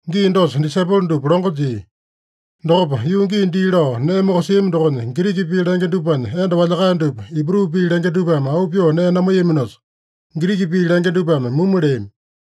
Gii dosa disaipolo dupa longo jia. Dokopa, yuu gii dii lao nee mokosiami dokonya Giriki pii lenge dupanya enda walyakae dupa Ibru pii lenge dupame auu pyoo nee namaiyaminosa, Giriki pii lenge dupame mumu leami.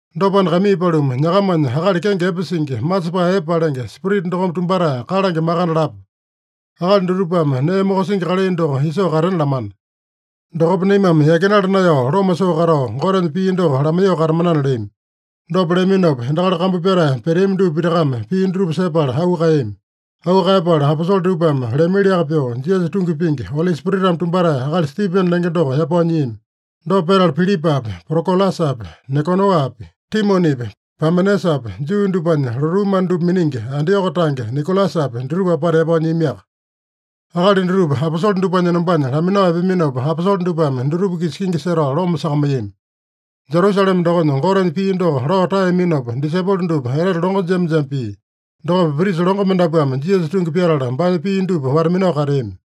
Dopana, kaimii paluma, nyakamanya akali kenge epe singi, masepae epe palenge, Spirita dokome tumbatae kalange makande lapa. Akali dutupame nee mokosingi kalai doko isoo katena lamana. Dokopa naimame yakinala naeyao loma soo katao, Gotenya pii doko lamaiyoo katamanana” leami. Dopa leaminopa, endakali kambu pyatae peteami dupa pitakame pii dutupa sepala auu kaeyami. Auu kaeyapala, aposole dupame leamiliaka pyoo, Jisasa tungi pingi, Oli Spiritame tumbatae akali Stipene lenge doko yapao nyiami. Dopa petala Pilipapi, Prokolasapi, Nikanoapi, Timonepi, Pamenasapi, Juu dupanya lotuu mana dupa miningi Antioko tange Nikolasapi, dutupa apata yapao nyiamiaka. Akali dutupa aposole dupanya enombanya laminao epeaminopa, aposole dupame dutupa-kisa kingi setao loma sakamaiyami. Jerusalema dokonya Gotenya pii doko lao taeyaminopa, disaipolo dupa etete longo jema-jema pia. Dokopa prisa longo mendapuame Jisasa tungi pyatala, baanya pii dupa wata-minao kateami.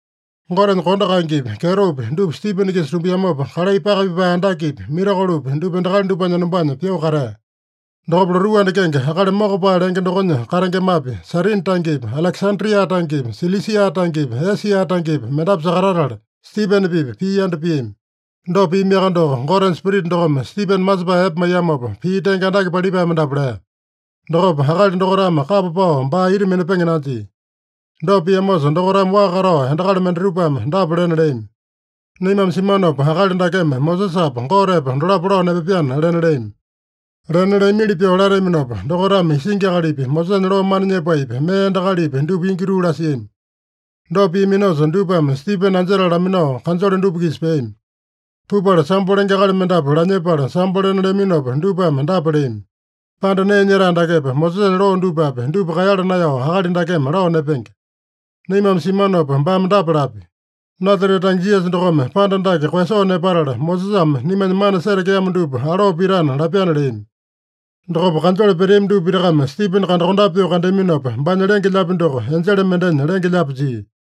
Gotenya kondo kaengepi, kyetopi dupa Stipene-kisa tumbiamopa, kalai paka pipae andakepi, mirakolopi, dupa endakali dupanya enombanya pyoo katea. Dokopa lotuu anda kenge Akali Mokopae lenge dokonya katengemapi, Sairini tangepi, Alekesandria tangepi, Silisia tangepi, Esia tangepi, mendapu sakatatala, Stipene-pipa pii yanda piami. Dopa piamiaka doko, Gotenya Spirita dokome Stipene masepae epe maiyamopa, pii tenge andake palipae mendapu lea. Dokopa akali dokaitame kapa pao baa ita minapenge nanjia. Dopa piamosa, dokaitame waa katao endakali mendatupame dapa lena leami: “Naimame simanopa akali dakeme Mosesapa, Gotepa dolapo lao nepapyana” lena leami. Lena leamili pyoo lateaminopa, dokaitame isingi akalipi, Mosesanya loo mana nyepaepi, mee endakalipi, dupa ingi tuu lasiami. Dopa piaminosa, dupame Stipene anjetala laminao, kanjole dupa-kisa peami. Pupala sambo lenge akali mendapu lanyepala sambo lena leaminopa, dupame dapa leami: “Panda nee nyetae dakepa, Mosesanya loo dupapi, dupa kaeyala naeyao akali dakeme lao nepenge. Naimame simanopa baame dapa lapya: ‘Nasarete tange Jisasa dokome panda dake koeyasoo nepatala, Mosesame naimanya mana setekeamo dupa aloo pitana’ lapyana” leami. Dokopa kanjole peteami dupa pitakame Stipene kandakondape pyoo kandeaminopa, baanya lenge-lyaapi doko enjele mendenya lenge-lyaapi jia.